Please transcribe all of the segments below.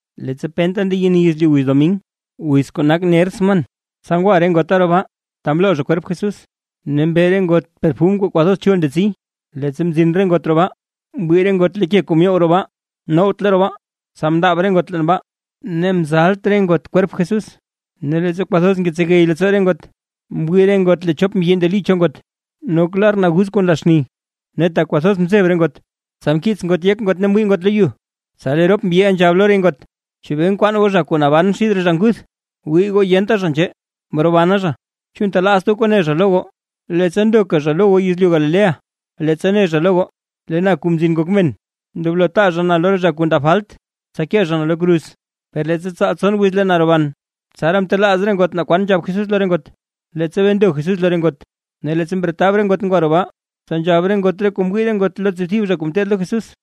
Leettsa penta ndeyeni yezlyu wiz domin wiz kuu nak ner sman, tsa ngwa re ngota roo baa ta mloo zha kwerp Jesús, ne mbe re ngot perfum kuu kwathoz chul ndetsi. Leettsa mzin re ngot roo baa, mwii re ngot lee ke kuu myow roo baa, nowtle roo baa. Tsa mndaab re ngot leen baa, ne mzalt re ngot kwerp Jesús. Ne leettsa kwathoz ngetsegey leettsoo re ngot, mwii re ngot lee chop mbyi ndeli cho ngot, nok lar naguz kuu nla xni. Ne tak kwathoz mzeb re ngot, tsa mkiits ngot yek ngot ne mwii ngot lo yu. Tsa lee rop mbyiʼa nzhab lo re ngot: ―¿Chebee nkwaan goo zha kuu naban xid re zha nguth? Wii goo yenta zha nzhee; mrobana zha. ¿Chu ntelaazt goo kuu ne zha lo goo, leettsa ndoka zha lo goo yezlyu Galilea? Leettsa ne zha lo goo: “Lee na Kuu Mzin Ngok Men, ndoblo taa zha na lo re zha kuu ndab falt, tsa kee zha na lo kruz, per leettsa tsaal tson wiz lee na roban”. Tsaraa mtelaaz re ngot naa kwan nzhab Jesús lo re ngot, leettsa bee ndo Jesús lo re ngot. Ne leettsa mretab re ngot ngwa roo baa, tsa nzhab re ngot re kuu mwii re ngot lo re tsiibthib zha kuu mteed lo Jesús,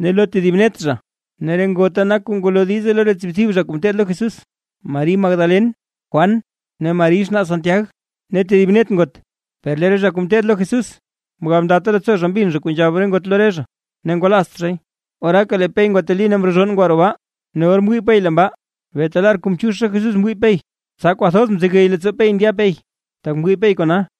ne lo tedib net zha. Ne re ngota nak kuu ngwalo diize lo re tsiibthib zha kuu mteed lo Jesús; Mari Magdalen, Juan ne Mari xnaa Santiag ne tedib net ngot. Per lee re zha kuu mteed lo Jesús mgab ndata leettsoo zha mbin zha re kuu nzhab re ngot lo re zha, ne ngwalaazt zhay. Oraaka lee Pey ngwateli ne mrozhonn ngwa roo baa. Ne or mzin Pey mwii Pey leen baa, ne beeta lar kuu mchiix zha Jesús mwii Pey, tsa kwathoz mzegey leettsoo Pey ndya Pey, tak mwii Pey kona.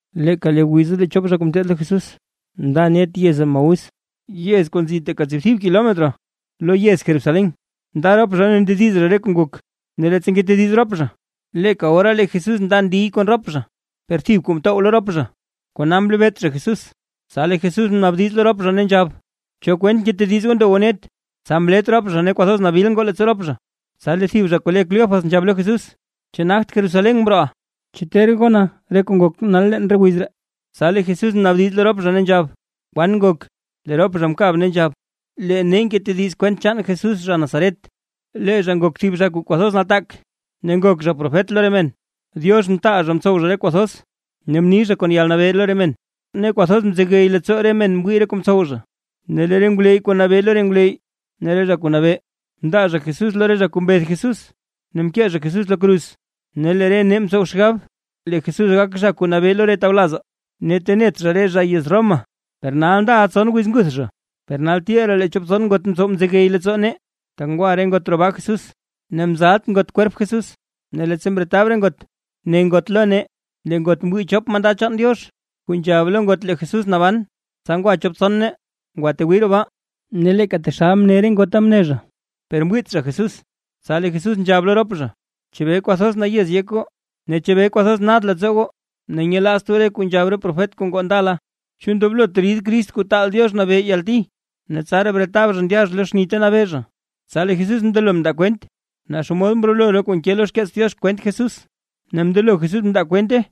Leeka wiza lee chop zha kuu mteed lo Jesús nda net yez Emaús, yez kuu nzi teeka tsiibthib kilometro lo yez Jerusalén. Nda rop zha ne ndediz zha re kuu ngok. Ne leettsa ngetediz rop zha, leeka ora lee Jesús nda ndiy kon rop zha, per thib kuu mtow lo rop zha, kona mlebeet zha Jesús. Tsa lee Jesús mnaabdiz lo rop zha ne nzhab: ―¿Cho kwent ngetediz goo ndo goo net? Tsa mlet rop zha ne kwathoz nabil ngoo leettsoo rop zha. Tsa lee thib zha kuu le Cleofas nzhab lo Jesús: ―¿Chu nagt Jerusalén mrooʼa? ¿Chu ter gona re kuu ngok nal leen re wiz ree? Tsa lee Jesús mnaabdiz lo rop zha ne nzhab: ―¿Kwan ngok? Lee rop zha mkab ne nzhab: ―Lee nee ngetediz kwent chaan Jesús zha Nazaret, lee zha ngok thib zha kuu kwathoz nataak ne ngok zha profet lo re men. Diox mtaal zha mtsow zha re kuu thoz, ne mni zha kon yalnabee lo re men, ne kwathoz mzegey leettsoo re men mwii re kuu mtsow zha. Ne lee re ngwleyy kuu nabee lo re ngwleyy ne re zha kuu nabee, mndaa zha Jesús lo re zha kuu mbeth Jesús, ne mkee zha Jesús lo kruz. Ne lee re nee mtsow xgab lee Jesús gak zha kuu nabee lo re tawlazaa, ne tenet zha re zha yez Roma, per nal ndaʼa tson wiz nguth zha. ¡Per nal til ree lee chop tson ngot mtsow mzegey leettsoo nee, tak ngwa re ngot roo baa Jesús, ne mzalt ngot kwerp Jesús! Ne leettsa mretab re ngot ne ngot lo nee, lee ngot mwii chop mandad chaan Diox, kuu nzhab lo ngot lee Jesús naban. Tsa ngwa chop tson nee, ngwatwii roo baa, ne leeka taxal mne re ngota ne zha, per mwiit zha Jesús. Tsa lee Jesús nzhab lo rop zha: ―¡Chebee kwathoz nayez yek goo! Ne ¿chebee kwathoz nad leettsoo goo ne nyelaazt goo re kuu nzhab re profet kuu ngoo ndala? ¿Chu ndoblot rid Crist Kuu Taal Diox Nabee yalti, ne tsaraa bretab zha ndya zha lo xni ta nabee zha? Tsa lee Jesús mndelo mndaa kwent naa xomod mrolo re kuu nke lo xkeets Diox kwent Jesús, ne mndelo Jesús mndaa kwente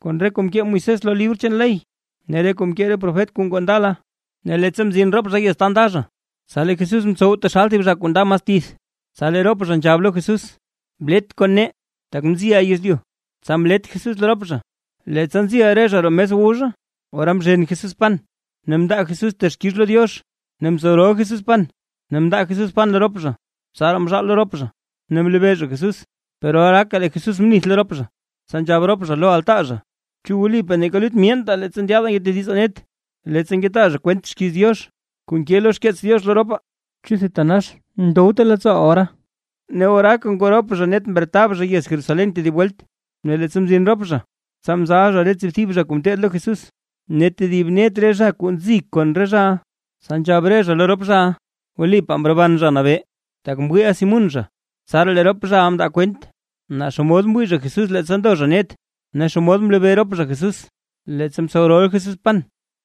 kon re kuu mkee Moisés lo re libr chaan ley ne re kuu mkee re profet kuu ngoo ndala. Ne leettsa mzin rop zha yez ta nda zha, tsa lee Jesús mtsow taxal thib zha kuu nda mas tith, tsa lee rop zha nzhab lo Jesús: ―Blet kon nee, tak mziʼa yezlyu. Tsa mlet Jesús lo rop zha. Leettsa nzi re zha roo mes wu zha, ora mzhen Jesús pan ne mndaa Jesús texkix lo Diox ne mtsow rol Jesús pan ne mndaa Jesús pan lo rop zha. Tsaraa mzhaal lo rop zha, ne mlebee zha Jesús. Per oraaka lee Jesús mnith lo rop zha. Tsa nzhab rop zha lo altaa zha: ―¿Chu wlipaa neeka lut myeentaa leettsa ndyaadaa ngetedizaa net, leettsa ngetaa zha kwent xkiiz Diox kuu nke lo xkeets Diox lo ropaa? ¿Chu thitanax mdowte leettsooʼaa ora? Ne oraaka ngoo rop zha net mretab zha yez Jerusalén tedib welt. Ne leettsa mzin rop zha tsa mzal zha re tsiibthib zha kuu mteed lo Jesús, ne tedib net re zha kuu nzi kon re zhaʼa. Tsa nzhab re zha lo rop zhaʼa: ―Wlipaa mroban Zha Nabee, tak mwiiʼa Simún zha. Tsaraa lee rop zhaʼa mndaa kwent, naa xomod mwii zha Jesús leettsa ndo zha net, ne xomod mlebee rop zha Jesús, leettsa mtsow rol Jesús pan.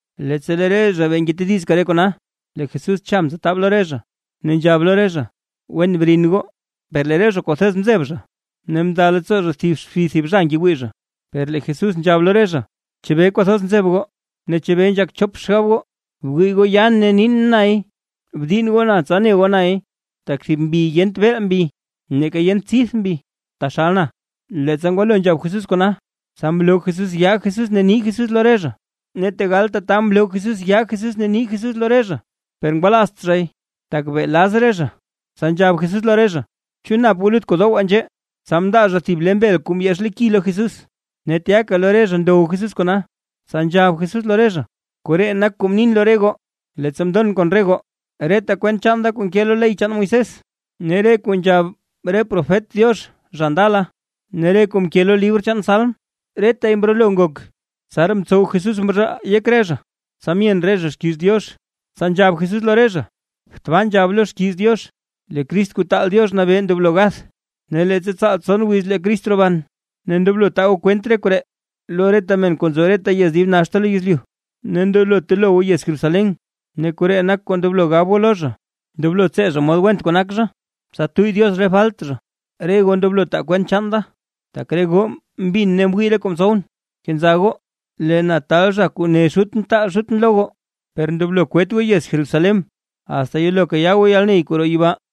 Leettsa lee re zha bee ngetedizka re kona, lee Jesús cha mtsetab lo re zha, ne nzhab lo re zha: ―Wen brin goo. Per lee re zha kwathoz mzeb zha, ne mnda leettsoo zha thib xbi thib zha ngewii. Per lee Jesús nzhab lo re zha: ―¿Chebee kwathoz nzeb goo? ¿Ne chebee nzhak chop xgab goo? Wii goo yaan ne niin. ¡Nay! Bdiinn goo na, tsa ne goo nay. Tak thib mbi yent beel mbi neeka yent tsidth mbi, taxal na. Leettsa ngwalo nzhab Jesús kona, tsa mloo Jesús yaa Jesús ne nii Jesús lo re zha. Ne tegal tata mloo Jesús yaa Jesús ne nii Jesús lo re zha, per ngwalaazt zhay, tak bee laz re zha. Tsa nzhab Jesús lo re zha: ―¿Chu nap goo lut kuu dowaa nzhee? Tsa mndaa zha thib le mbel kuu mbyex lo ki lo Jesús. Ne tyaka lo re zha ndow Jesús kona. Tsa nzhab Jesús lo re zha: ―Koree nak kuu mnin lo re goo, leettsa mndon kon re goo, reta kwent chaan da kuu nke lo ley chaan Moisés, ne re kuu nzhab re profet Diox zha ndala, ne re kuu mke zha lo libr chaan salm, retay mrolo. Tsaraa mtsow Jesús mzhaal yek re zha, tsa myen re zha xkiiz Diox. Tsa nzhab Jesús lo re zha: ―Tbaa nzhab lo xkiiz Diox lee Crist Kuu taal Diox Nabee ndoblo gath, ne leettsa tsaal tson wiz lee zha roban, ne ndoblo taa goo kwent re koree lo reta men kuu nzo reta yez dib naxta lo yezlyu, ne ndoblo telo goo yez Jerusalén, ne koree nak kuu ndoblo gab goo lo zha, ndoblo tsee zha mod went kuu nak zha, tsa tuyy Diox re falt zha. Re goo ndoblo taa kwent chaan da, tak re goo mbin ne mwii re kuu mtsowʼn. Kenza goo. Lee na taal zha kuu mne Xutʼn taal Xutʼn lo goo, per ndoblo kwet goo yez Jerusalén, asta yelo kayaa goo yalney kuu roo yibaa.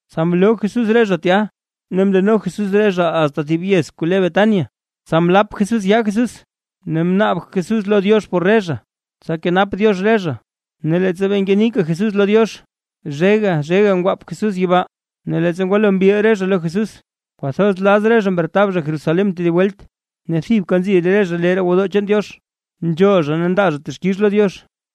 Tsa mloo Jesús re zha tya ne mndeno Jesús re zha asta thib yez kuu le Betania, tsa mlap Jesús yaa Jesús ne mnaab Jesús lo Diox por re zha, tsa kenap Diox re zha. Ne leettsa bee ngenika Jesús lo Diox, zhega zhega ngwaap Jesús yibaa. Ne leettsa ngwalo mbil re zha lo Jesús, kwathoz laz re zha mretab zha Jerusalén tedib welt. Ne thibka nzi re zha lee roo gwodoo chaan Diox, nzhool zha ne ndaa zha texkix lo Diox.